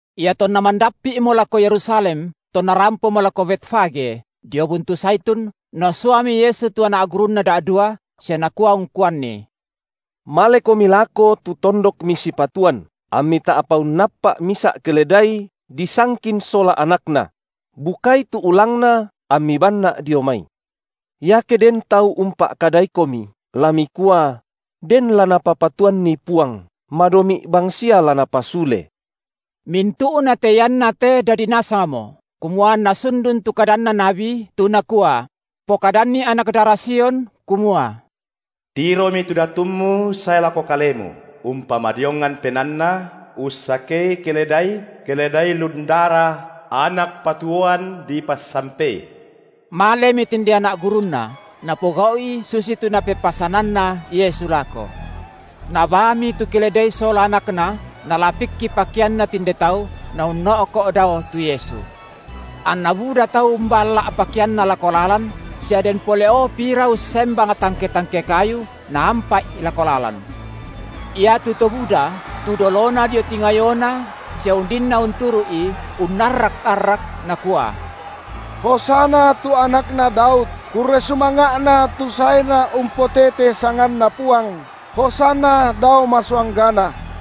Iatonna mandappi’mo lako Yerusalem tonna rampomo lako Betfage, dio buntu Zaitun, Nasuami Yesu tu anak gurunNa da’dua, sia Nakua ungkuanni: Malekomi lako tu tondok misipatuan, ammi ta’pa unnappa’ misa’ keledai disangkin sola anakna; bukai tu ulangna ammi banNa’ dio mai. Iake den tau umpa’kadaikomi, la mikua: den la Napapatuanni Puang, madomi’ bang sia la Napasule. Mintu’nate iannate dadi nasangmo, kumua anna sundun tu kadanna nabi, tu nakua: Pokadanni anak dara Sion, kumua: Tiromi tu Datummu sae lako kalemu, umpamadiongan penaanNa, ussakei keledai, keledai lundara, anak patuoan dipassampei. Malemi tinde anak gurunNa, napogau’i susitu Napepasananna Yesu lako. Nabaami tu keledai sola anakna nalapikki pakeanna tinde tau, Naunno’ko’ dao tu Yesu. Anna buda tau umballa’ pakeanna lako lalan sia den pole’o pira ussembang tangke-tangke kayu, naampa’i lako lalan. Iatu to buda, tu dolona dio tingayoNa sia undinna unturu’I, unnarrak-arrak, nakua: Hosanna tu Anakna Daud, Kurre sumanga’Na tu saeNa umpotete sanganNa Puang, Hosanna dao masuanggana.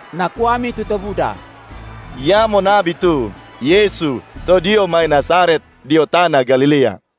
Nakuami tu to buda: Iamo nabi tu, Yesu to dio mai Nazaret dio tana Galilea.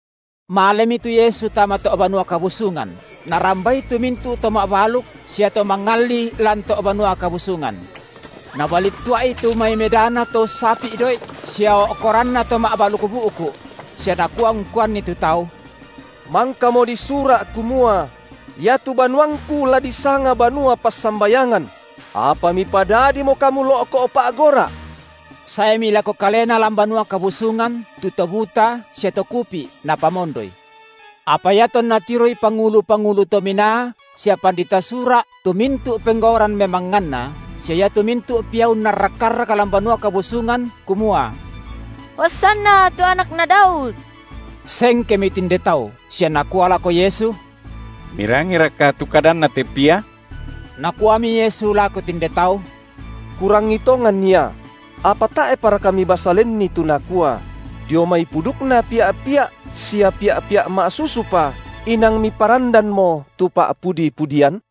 Malemi tu Yesu tama to’ Banua Kabusungan, Narambai tu mintu’ to ma’baluk sia to mangalli lan to’ Banua Kabusungan. Nabalittua’i tu mai medana to ussapi’ doi’ sia o’koranna to ma’baluk bu’ku’; sia Nakua ungkuanni tu tau: Mangkamo disura’ kumua: Iatu banuangKu la disanga banua passambayangan; apa mipadadimo kamu lo’ko’ pa’gora’. Saemi lako Kalena lan Banua Kabu- sungan tu to buta sia to kupi’, Napa- mondoi. Apa iatonna tiroi pangulu-pangulu to minaa sia pandita Sura’ tu mintu’ penggauran memangnganNa, sia iatu mintu’ pia unnarrak-arrak lan Banua Kabusungan kumua: Hosanna tu Anakna Daud, sengkemi tinde tau, sia nakua lako Yesu: Mirangiraka tu kadanna te pia? Nakuami Yesu lako tinde tau: Kurangi tongan ia; apa tae’paraka mibasa lenni tu nakua: Dio mai pudukna pia’-pia’ sia pia’-pia’ ma’susupa inang Miparandanmo tu pa’pudi-pudian?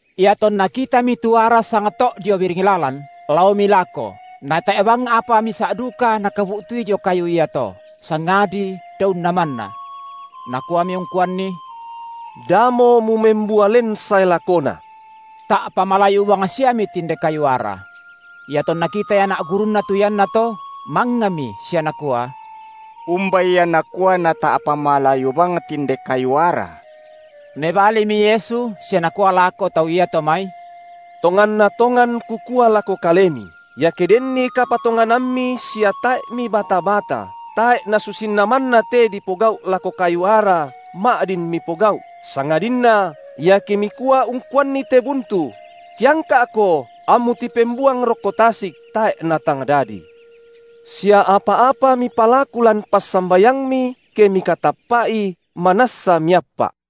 Iatonna kitami tu ara sangto’ dio biring lalan, laomi lako, natae’ bang apa misa’ duka Nakabu’tui dio kayu iato, sangadi daunna manna. Nakuami ungkuanni: Damo mumembua len sae lakona! Ta’pa malayu bangsiami tinde kayu ara. Iatonna kitai anak gurunNa tu iannato, mangngami sia nakua: Umba ia nakua nata’pa malayu bang tinde kayu ara? Mebalimi Yesu sia Nakua lako tau iato mai: Tonganna tongan Kukua lako kalemi, iake denni kapatonganammi sia tae’ mibata-bata, tae’ nasusinna manna te dipogau’ lako kayu ara ma’din mipogau’ sangadinna iake mikua ungkuanni te buntu: Tiangka’ko ammu tipembuang rokko tasik, tae’ natang dadi. Sia apa-apa mipalaku lan passambayangmi, ke mikatappa’i, manassa miappa’.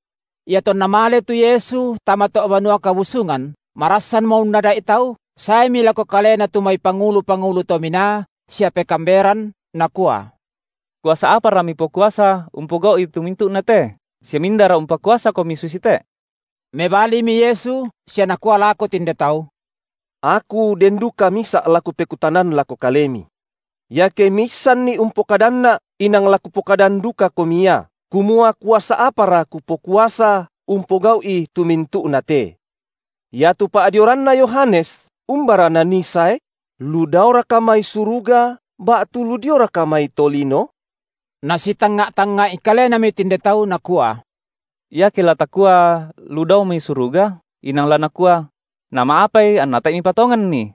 Iatonna male tu Yesu tama to’ Banua Kabusungan, marassanmo unnada’i tau, saemi lako Kalena tu mai pangulu-pangulu tominaa sia pekaamberan, nakua: Kuasa apara Mipokuasa umpogau’i tu mintu’na te sia mindara umpakuasaKomi susite? Mebalimi Yesu sia Nakua lako tinde tau: Aku den duka misa’ la Kupekutanan lako kalemi. Iake miissanni umpokadanNa’ inang la Kupokadan dukakomi ia, kumua kuasa apara Kupokuasa umpogau’i tu mintu’nate. Iatu pa’dioranna Yohanes, umbara nanii sae? Lu daoraka mai suruga, ba’tu lu dioraka mai tolino? Nasitangnga’-tangnga’i kalenami tinde tau nakua: Iake la takua, lu dao mai suruga, inang la Nakua: nama’apai anna tae’ mipatonganni?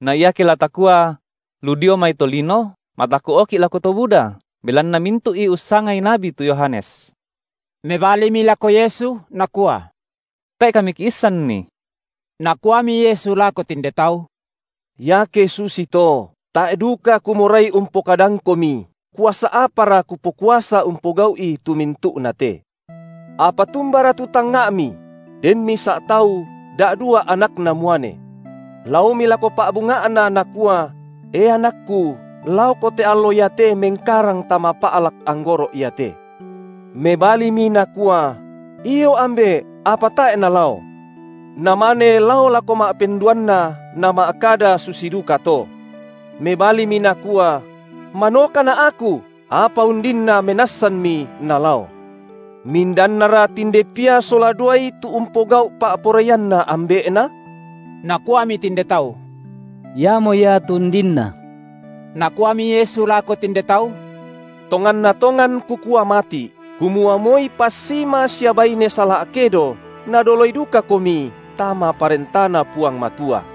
Na iake la takua: lu dio mai tolino, mataku’oki’ lako to buda, belanna mintu’i ussangai nabi tu Yohanes. Mebalimi lako Yesu, nakua: Tae’ kami kiissanni. Nakuami Yesu lako tinde tau: Iake susito tae’ duka Kumorai umpokadangkomi, kuasa apara Kupokuasa umpogau’i tu mintu’nate. Apa tumbara tu tangnga’mi? Den misa’ tau da’dua anakna muane. Laomi lako pa’bunga’na nakua: E anakku, laoko te allo iate mengkarang tama pa’lak anggoro’ iate. Mebalimi nakua: Io ambe’, apa tae’ nalao. Namane lao lako ma’penduanna nama’kada susi dukato. Mebalimi nakua: Manokana’ aku, apa undinna menassanmi, nalao. Mindannara tinde pia sola duai tu umpogau’ pa’poraianna ambe’na? Nakuami tinde tau: Iamo ia tu undinna. Nakuami Yesu lako tinde tau: Tonganna tongan Kukua mati’, kumua moi passima sia baine sala’kedo nadoloi dukakomi tama ParentaNa Puang Matua.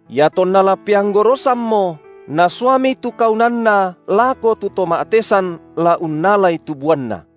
Iatonna la peanggorosammo, nasuami tu kaunanna lako tu to ma’tesan la unnalai tu buanna.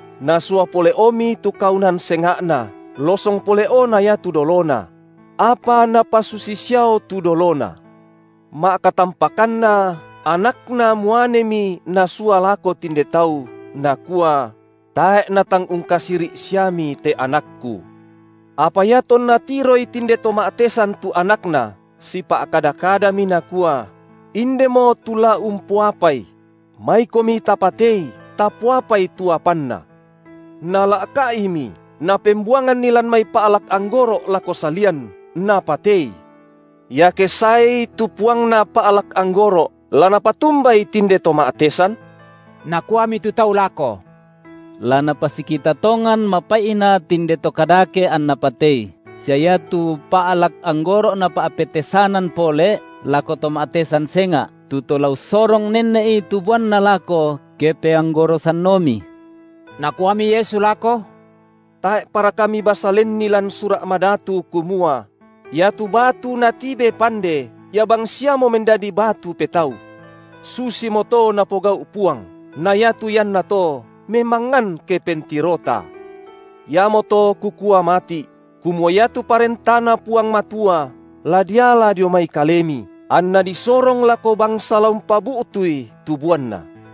Nasua pole’omi tu kaunan senga’na, losong pole’o na iatu dolona; apa napasusi siao tu dolona. Ma’katampakanna anakna muanemi nasua lako tinde tau, nakua: Tae’ natang ungkasiri’ siami te anakku. Apa iatonna tiroi tinde to ma’tesan tu anakna, sipa’kada-kadami, nakua: Indemo tu la umpoapai; maikomi tapatei, tapoapai tu apanna. Nala’ka’imi napembuanganni lan mai pa’lak anggoro’ lako salian, napatei. Iake saei tu puangna pa’lak anggoro’, la napatumbai tinde to ma’tesan? Nakuami tu tau lako: La napasikita tongan mapaina’ tinde to kadake anna patei, sia iatu pa’lak anggoro’ napa’petesanan pole’ lako to ma’tesan senga’, tu to la ussorong nenne’i tu buanna lako ke peanggorosanomi. Nakuami Yesu lako: Tae’paraka mibasa lenni lan Sura’ madatu kumua: Iatu batu natibe pande, ia bangsiamo mendadi batu petau. Susimoto Napogau’ Puang, na iatu iannato memangngan ke pentirota. Iamoto Kukua mati’, kumua iatu ParentaNa Puang Matua la diala dio mai kalemi, anna disorong lako bangsa la umpabu’tui tu buanna.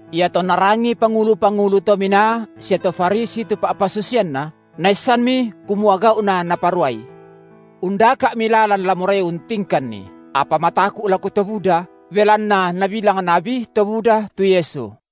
Iatonna rangii pangulu-pangulu to minaa sia to Farisi tu pa’pasusianNa, naissanmi kumua gau’na Naparuai. Undaka’mi lalan la morai untingkanNi, apa mataku’ lako to buda, belanna nabilang nabi to buda tu Yesu.